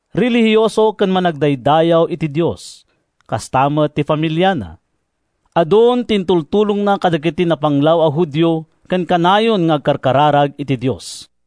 Relihioso ken managdaydayaw iti Dios, kasta met ti familiana. Adun ti intultulongna kadagiti napanglaw a Judio ken kanayon nga agkararag iti Dios.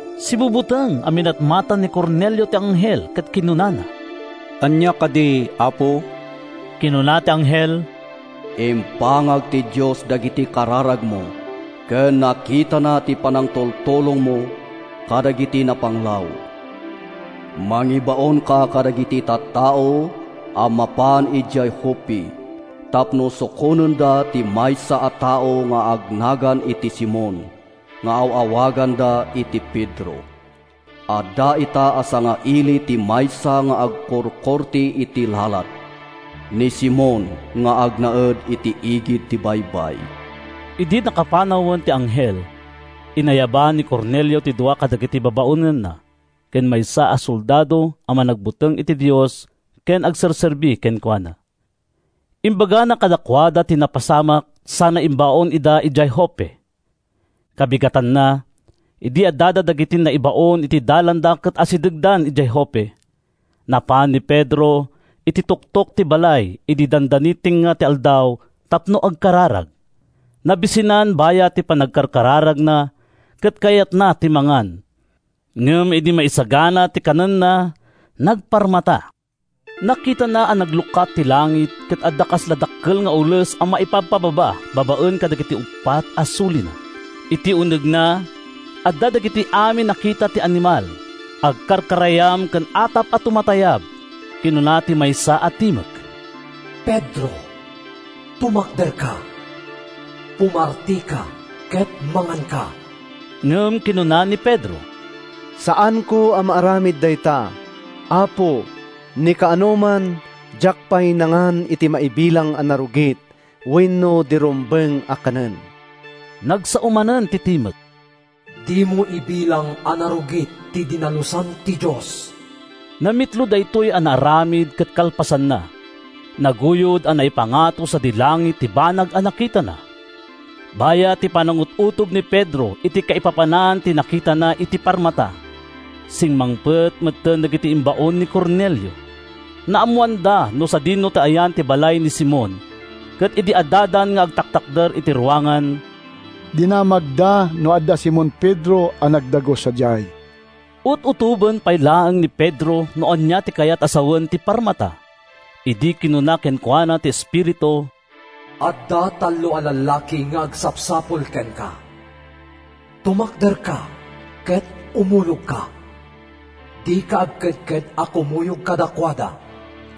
Sibubuteng a minatmatan ni Cornelio ti anghel ket kinunana, “Ania kadi, Apo?” Kinuna ti anghel, “Impangag ti Dios dagiti kararagmo ken nakitana ti panangtultulongmo kadagiti napanglaw. Mangibaonka kadagiti tattao a mapan idiay Joppe tapno sukonenda ti maysa a tao nga agnagan iti Simon nga aw-awaganda iti Pedro. Adda ita a sangaili ti maysa nga agkurkurte iti lalat, ni Simon nga agnaed iti igid ti baybay.” Idi nakapanawen ti anghel, inayaban ni Cornelio ti dua kadagiti babaonenna ken maysa a soldado a managbuteng iti Dios ken agserserbi kenkuana. Imbagana kadakuada ti napasamak sana imbaon ida idiay Joppe. Kabigatanna, idi adda dagiti naibaon iti dalanda ket asidegdan idiay Joppe, napan ni Pedro iti tuktok ti balay idi dandani tengnga ti aldaw tapno agkararag. Nabisinan bayat ti panagkarkararagna ket kayatna ti mangan. Ngem idi maisagsagana ti kanenna, nagparmata. Nakitana a naglukat ti langit ket adda kasla dakkel nga ules a maipabpababa babaen kadagiti uppat a sulina. Iti unegna, adda dagiti amin a kita ti animal, agkarkarayam ken atap a tumatayab. Kinuna ti maysa a timek, “Pedro, tumakderka. Pumartika ket manganka.” Ngem kinuna ni Pedro, “Saanko a maaramid dayta, Apo. Ni kaanoman, diak pay nangan iti maibilang a narugit wenno di rumbeng a kanen.” Nagsao manen ti timek, “Dimo ibilang a narugit ti dinalusan ti Dios.” Namitlo daytoy a naaramid ket kalpasanna, naguyod a naipangato sadi langit ti banag a nakitana. Bayat ti panangut-utob ni Pedro iti kaipapanan ti nakitana iti parmata, simmangpet metten dagiti imbaon ni Cornelio. Naammoanda no sadino ti ayan ti balay ni Simon ket idi addadan nga agtatakder iti ruangan, dinamagda no adda Simon Pedro a nagdagus sadiay. Ut-utoben pay laeng ni Pedro no ania ti kayat a sawen ti parmata, idi kinuna kenkuana ti Espiritu, “Adda tallo a lallaki nga agsapsapul kenka. Tumakderka ket umulogka. Dika agkedked a kumuyog kadakuada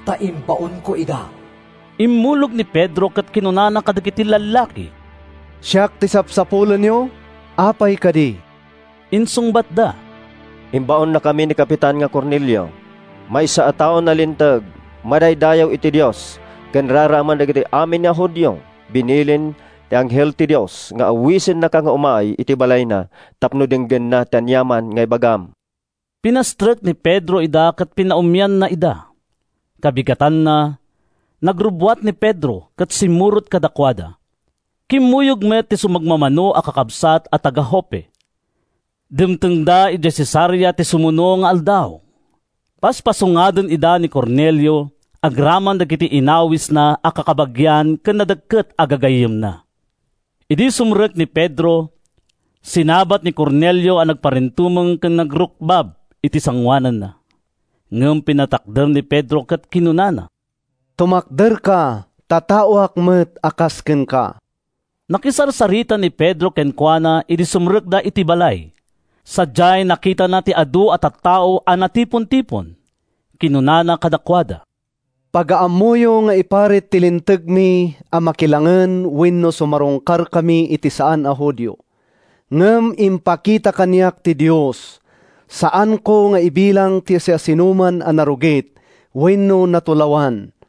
ta imbaonko ida.” Immulog ni Pedro ket kinunana kadagiti lallaki, “Siak ti sapsapulenyo. Apay kadi?” Insungbatda, “Imbaonnakami ni kapitan Cornelio, maysa a tao a nalinteg, managdaydayaw iti Dios ken raraemen dagiti amin a Judio. Binilin ti anghel ti Dios nga awisennaka nga umay iti balayna tapno denggenna ti aniaman nga ibagam.” Pinastrek ni Pedro ida ket pinaummianna ida. Kabigatanna, nagrubbuat ni Pedro ket simmurot kadakuada. Kimmuyog met ti sumagmamano a kakabsat a taga-Joppe. Dimtengda idiay Cesarea iti sumuno nga aldaw. Paspasungaden ida ni Cornelio agraman dagiti inawisna a kakabagian ken nadekket a gagayyemna. Idi sumrek ni Pedro, sinabat ni Cornelio a nagparintumeng ken nagrukbab iti sangoananna. Ngem pinatakder ni Pedro ket kinunana, “Tumakderka, ta taoak met a kas kenka!” Nakisarsarita ni Pedro kenkuana idi sumrekda iti balay. Sadiay, nakitana ti adu a tattao a natipontipon. Kinunana kadakuada, “Pagaammoyo nga iparit ti Lintegmi a makilangen wenno sumarungkarkami iti saan a Judio. Ngem impakita kaniak ti Dios a saanko nga ibilang ti siasinoman a narugit wenno natulawan.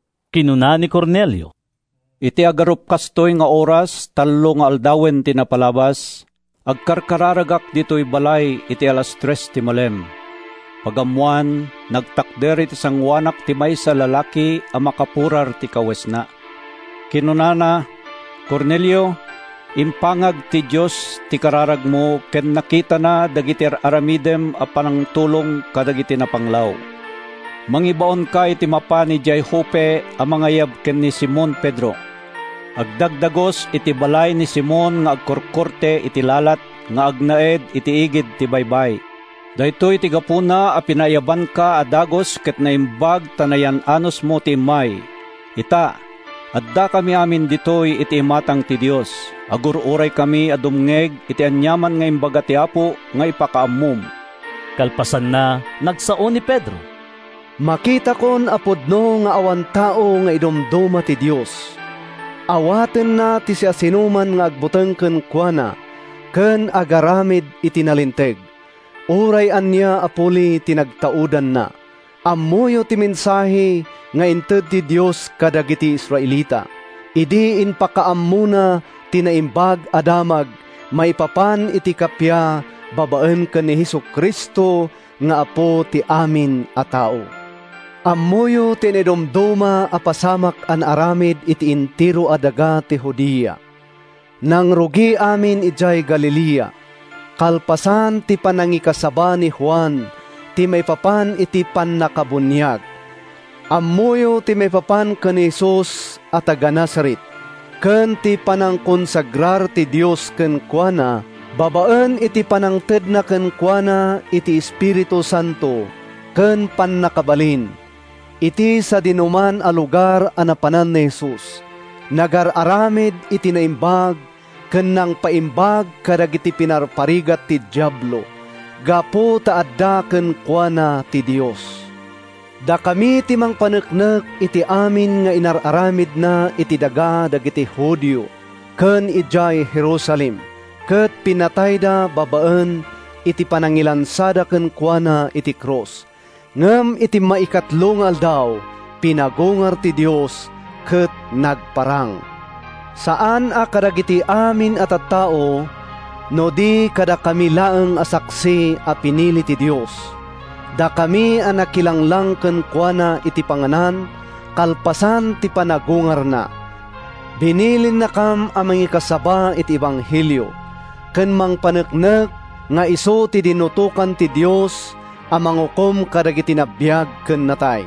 Kinuna ni Cornelio, “Iti agarup kastoy nga oras tallo nga aldawen ti napalabas, agkarkararagak ditoy balay iti alas tres ti malem. Pagammoan, nagtakder iti sangoanak ti maysa a lalaki a makapurar ti kawesna. Kinunana, ‘Cornelio, impangag ti Dios ti kararagmo ken nakitana dagiti ar-aramidem a pangtultulong kadagiti napanglaw. Mangibaonka iti mapan idiay Joppe a mangayab ken ni Simon Pedro. Agdagdagus iti balay ni Simon nga agkurkurte iti lalat, nga agnaed iti igid ti baybay.’ “Daytoy ti gapuna a pinaayabanka a dagus ket naimbag ta nayan-anusmo ti immay. Ita, addakami amin ditoy iti imatang ti Dios. Agur-uraykami a dumngeg iti aniaman nga imbaga ti Apo nga ipakaammom.” Kalpasanna, nagsao ni Pedro: “Makitakon a pudno nga awan tao nga idumduma ti Dios. Awatenna ti siasinoman nga agbuteng kenkuana ken agaramid iti nalinteg, uray ania a puli ti nagtaudanna. Ammoyo ti mensahe nga inted ti Dios kadagiti Israelita, idi impakaammona ti Naimbag a Damag maipapan iti kappia babaen ken ni Jesu-Cristo nga Apo ti amin a tao. Ammoyo ti naidumduma a pasamak a naaramid iti entero a daga ti Judea. Nangrugi amin idiay Galilea kalpasan ti panangikasaba ni Juan ti maipapan iti pannakabuniag. “Ammoyo ti maipapan ken ni Jesus a taga-Nazaret, ken ti panangkonsagrar ti Dios kenkuana babaen iti pannangtedna kenkuana iti Espiritu Santo ken pannakabalin. Iti sadinoman a lugar a napanan ni Jesus, nagar-aramid iti naimbag ken nangpapaimbag kadagiti pinarparigat ti Diablo, gapu ta adda kenkuana ti Dios. Dakami ti mangpaneknek iti amin nga inar-aramidna iti daga dagiti Judio ken idiay Jerusalem. Ket pinatayda babaen iti panangilansada kenkuana iti krus. Ngem iti maikatlo nga aldaw, pinagungar ti Dios ket nagparang, saan a kadagiti amin a tattao no di kadakami laeng a saksi a pinili ti Dios—dakami a nakilanglang kenkuana iti panganan kalpasan ti panagungarna. Binilinnakam a mangikasaba iti ebanghelio ken mangpaneknek nga isu ti dinutokan ti Dios a mangukom kadagiti nabiag ken natay.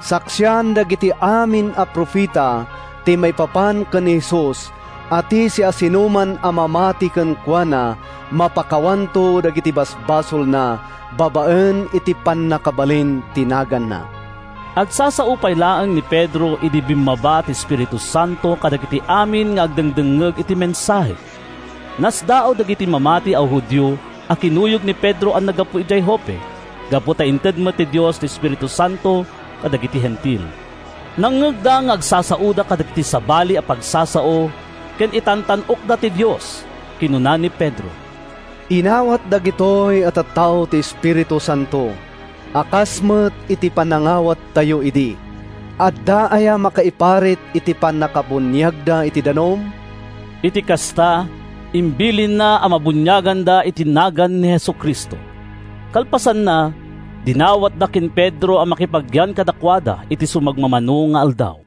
Saksian dagiti amin a profeta ti maipapan ken ni Jesus a ti siasinoman a mamati kenkuana, mapakawanto dagiti basbasolna babaen iti pannakabalin ti naganna.” Agsasao pay laeng ni Pedro idi bimmaba ti Espiritu Santo kadagiti amin nga agdengdengngeg iti mensahe. Nasdaaw dagiti mamati a Judio a kinakuyog ni Pedro a naggapu idiay Joppe gapu ta inted met ti Dios ti Espiritu Santo kadagiti Hentil. Nangngegda nga agsasaoda kadagiti sabali a pagsasao ken itantan-okda ti Dios. Kinuna ni Pedro, “Inawat dagitoy a tattao ti Espiritu Santo a kas met iti panangawattayo idi. Adda aya makaiparit iti pannakabuniagda iti danum?” Iti kasta, imbilinna a mabuniaganda iti nagan ni Jesu-Cristo. Kalpasanna, dinawatda ken ni Pedro a makipagyan kadakuada iti sumagmamano nga aldaw.